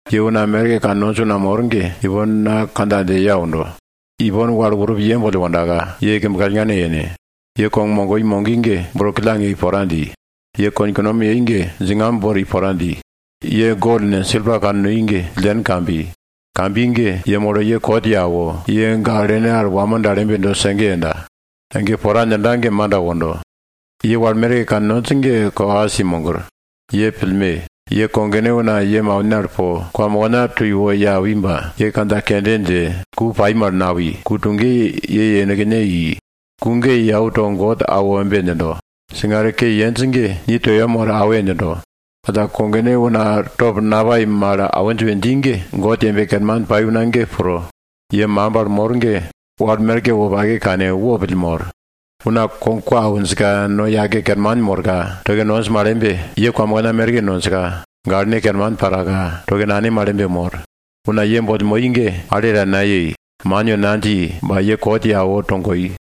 Ye una wal merke kannonj una mor ge, ipon na kandja dje ye aundo. Ipon wal urup ye boll wondaka ye kimb kallngane yene. Ye kog mogoi mogi ge, bro killang yei pora dji. Ye konkunom yei ge, djingamb bori pora dji. Ye gol ne, silpa kannoi ge killen kambi. Kambi ge yemolo ye kot ye awo, ye gaklene al wamo mal embe do sege yenda. Ege pora djinda ge manda wondo. Ye wal merke kannonj ge kokas kulo i mogir. Ye pillme! Ye kogone una ye maune al po kwamokna to iwo ye awi ba ye kandja kende dje ku pai mal nawi, ku tuge ye yenekne i. Ku ge yau to God awo embe djindo, singare ke yenj ge ni to yem woro awe! djindo. Alla kogone una top napai mal awinj we dji ge, God yembe kerman pai una ge pro. Ye makimb al mor ge, wal merke wopake kane, wopille mor. Una kog kwa awinjka no yake kerman morka toke nonj mal embe, ye kwamokna merke nonjka gaklene kerman paraka toke nane mal embe mor. Una ye boll moi ge, ale ta nayei, man we nadji ba ye kot ye awo togoi.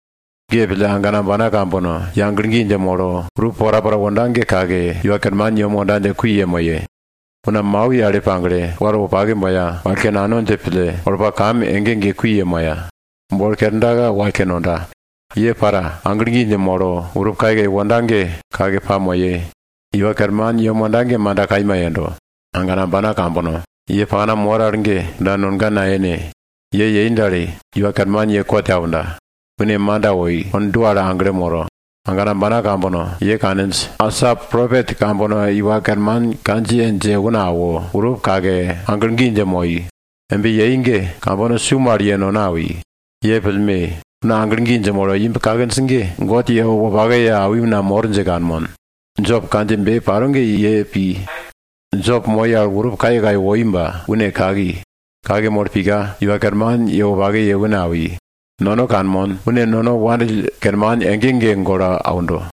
Ge pille, agana ambana kambono, ye aglo gi dje molo, urup porapora wonda ge kake, Iwa Kerman yem wonda dje kui yemoye. Una ta mau al wal yale pagle, wal wopake boya, wallko nano dje pille, olpa kam ge kui yemoya. Bolo kerdaka, wallko nonda. Ye para, aglo gi dje molo urup kayekaye wonda ge, kake pamoye. Iwa Kerman yem wonda ge manda kaima yendo. Agana ambana kambono, ye pakna mor al ge kunda nonga nayene. Ye embe yei dal, Iwa Kerman ye kot ye aunda. Une manda woi, kond dua al aglo moro. Agana ambana kambono, ye kaninj, asa propet kambono Iwa Kerman kandjiye dje una awo, urup kake, aglo gi dje moi. Embe yei ge kambono su mal ye nono awi. Ye pillme! Una aglo gi dje molo imb kakinj ge, God ye wopake ye awi una mor dje kanmon. Jop kandjiyebe paro ge ye pir, Jop moi al urup kayekaye woi ba une kaki. Kake molo pika, Iwa Kerman ye wopake ye une awi. Nono kanmon, une nono wandill kerman ege ege golo aundo.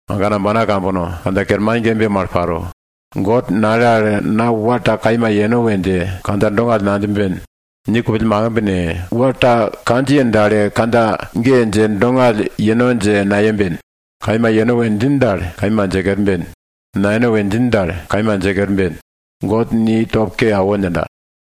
Agana ambana kambono, kandja kerman ge embe paro. God nale al na wal ta kaima yeno we dje kandja dongall nadjimben. Ni kupill makimb ne, wal ta kandjiye dale kandja ge dje dongall yeno dje nayemben. Kaima yeno we djin dal, kaima dje kerben. Nayeno we djin dal, kaima dje kerben. God ni top ke awo djinda.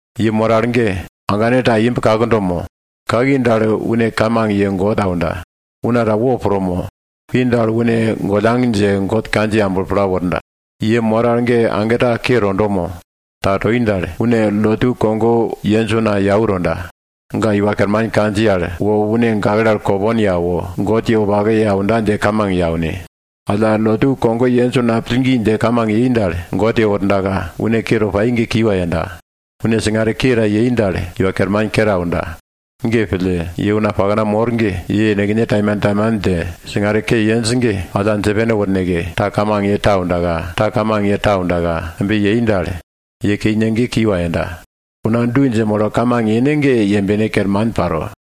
Ye mor al ge, agane ta imb kakdo mo? Kaki dal, une kamang ye God aunda. Una ta wopro mo? Pi dal, une gollang dje God kandjiye amblo pla worda. Ye mor al ge, agane ta ke tondo mo? Ta toi dal, une lotu kogo yenj una yau tonda. Ga Iwa Kerman kandjiye al wo une gakle al kopong ye awo, God ye wopake ye aunda dje kamang ye aune. Alla lotu kogo yenj una pillgi dje kamang yei dal, God yewordaka une ke to pai ge kiwa yenda. Une singare ke ta yei dal, Iwa Kerman kere aunda. Ge pille, ye una pakna mor ge ye yenekne taimantaiman dje singare ke yenj ge, alla dje pene worneke, ta kamang ye ta aundaka, ta kamang ye ta aundaka, embe yei dal, ye keine ge kiwa yenda. Una du dje molo kamang yene ge, yembe kerman paro.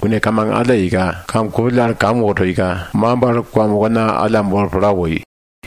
Une kamang alla yeika, kam kupill al kam wo toika, makimb al kwamokna alla bolo pla woi.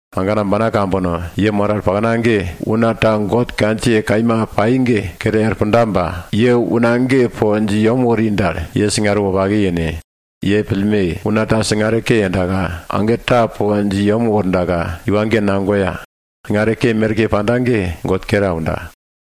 Agana ambana kambono, ye mor al pakna ge, una ta God kandjiye kaima pai ge kere er punda ba ye une ge po dje i yem wori dal, ye singare wopake yene. Ye pillme! Una ta singare ke yendaka, age ta po dje i yem wordaka, iwa ge nagoya, singare ke merke panda ge God kere aunda.